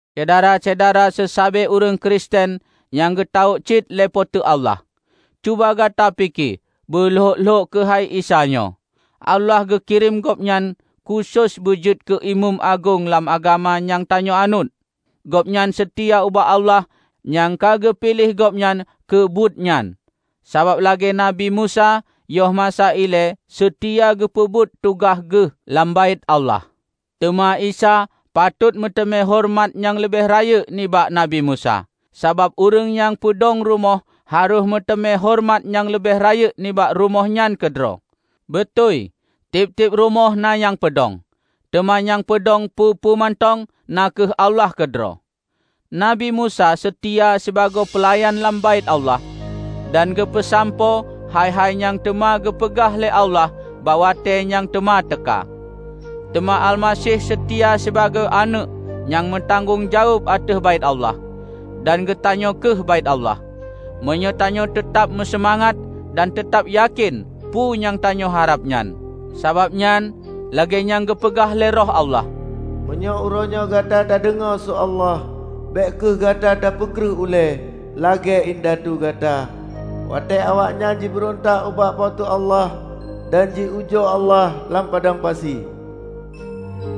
Syedara-syedara seusabe ureuëng Kristen nyang geutawök cit lé Po teu Allah! Cuba gata pike beu lhok-lhok keuhai Isa nyoe! Allah geukirém Gobnyan khusos beujeuet keu Imeum Agong lam agama nyang tanyoe anut. Gobnyan seutia ubak Allah nyang ka geupiléh Gobnyan keubuet nyan, saban lagée Nabi Musa yoh masa ilée seutia geupeubuet tugaih geuh lam Baét Allah. Teuma Isa patot meuteumé horeumat nyang leubeh rayeuk nibak Nabi Musa. Sabab ureuëng nyang peudong rumoh harôh meuteumé horeumat nyang leubeh rayeuk nibak rumoh nyan keudroe. Beutôi tieb-tieb rumoh na nyang peudong, teuma nyang paeudong peue-peue mantong na kheueh Allah keudroe. Nabi Musa seutia sibagoe peulayan lam Baét Allah dan geupeusampoe hai-hai nyang teuma geupeugah lé Allah bak watée nyang teuma teuka. Teuma Almaseh seutia sibagoe Aneuëk nyang meutanggong jaweueb ateueh Baét Allah. Dan geutanyoe kheueh Baét Allah, meunyoe tanyoe teutab meuseumangat dan teutab yakén peue nyang tanyoe harab nyan. Sabab nyan, lagée nyang geupeugah lé Roh Allah, "Meunyoe uroenyoe gata tadeungoe su Allah, bék kheueh gata tapeukreuh ulée, lagée indatu gata, watée awaknyan jibeurontak ubak Po teu Allah, dan ji ujoe Allah lam padang pasi.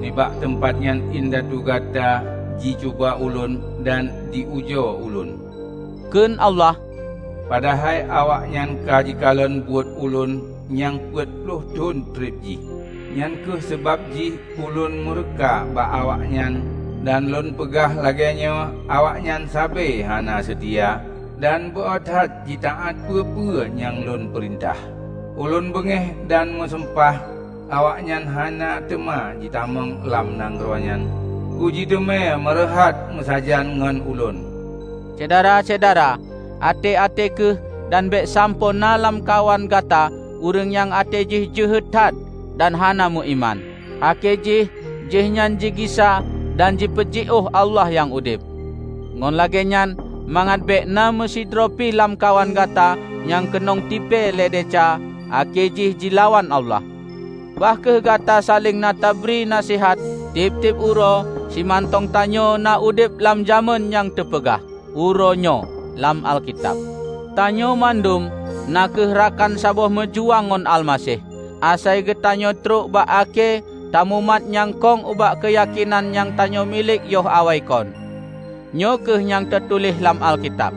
'Nibak teumpat nyan indatu gata ji cuba Ulôn, dan ji ujoe Ulôn,' kheun Allah, 'Padahai awaknyan ka jikalon buet Ulôn nyang peuet ploh thon treb jih.' Nyang kheueh sabab jih Ulôn meureuka bak awaknyan dan Lôn peugah lagée nyoe, 'Awaknyan sabe hana seutia, dan beu-oe that jitaát peue-peue nyang Lôn peurintah.' Ulôn beungéh dan meusumpah, 'Awaknyan hana teuma jitamong lam nanggroe nyan keujiteumé meureuhat meusajan ngon ulôn.' " Syedara-syedara, até-até kheueh dan bék sampoe na lamkawan gata ureuëng nyang até jih jeuhet that dan hana meuiman, akhé jih jihnyan jigisa dan jipeujiôh Allah nyang udeb! Ngon lagée nyan, mangat bék na meusidroe pi lamkawan gata nyang keunong tipée lé desya akhé jih jilawan Allah, bah kheueh gata saléng na tabri naseuhat tieb-tieb uroe simantong tanyoe na udeb lam jamén nyang teupeugah "Uroe Nyoe" lam Alkitab. Tanyoe mandum na kheueh rakan saboh meujuang ngon Almaseh, asai geutanyoe trok bak akhé tamumat nyang kong ubak keuyakénan nyang tanyoe milék yoh awai kon. Nyoe kheueh nyang teutuléh lam Alkitab,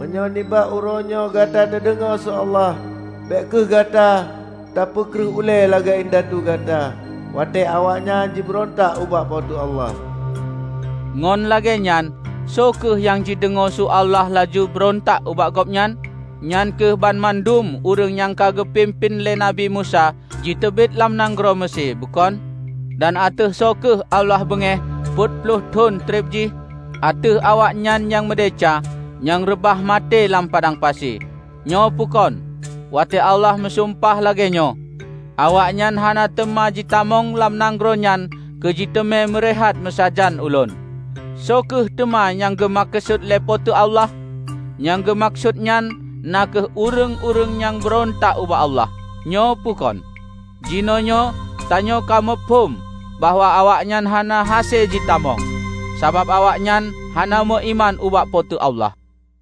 "Meunyoe nibak uroe nyoe gata teudeungoe su Allah, bék kheueh gata tapeukreuh ulée, lagée indatu gata, watée awaknyan jibeurontak ubak Po teu Allah." Ngon lagée nyan, soe kheueh nyang jideungoe su Allah laju beurontak ubak Gobnyan? Nyan kheueh banmandum ureuëng nyang ka geupimpén lé Nabi Musa jiteubiet lam nanggroe Meusé, bukon? Dan ateueh soe kheueh Allah beungéh peuet ploh thon treb jih? Ateueh awaknyan nyang meudesya, nyang reubah maté lam padang pasi, nyoe peue kon? Watée Allah meusumpah lagée nyoe, "Awaknyan hana teuma jitamong lam nanggroe nyan keujiteumé meureuhat meusajan Ulôn" -- soe kheueh teuma nyang geumeukeusut lé Po teu Allah? Nyang geumeukeusut nyan na kheueh ureuëng-ureuëng nyang beurontak ubak Allah, nyoe peue kon? Jinoenyoe tanyoe ka muphom bahwa awaknyan hana hase jitamong, sabab awaknyan hana meuiman ubak Po teu Allah.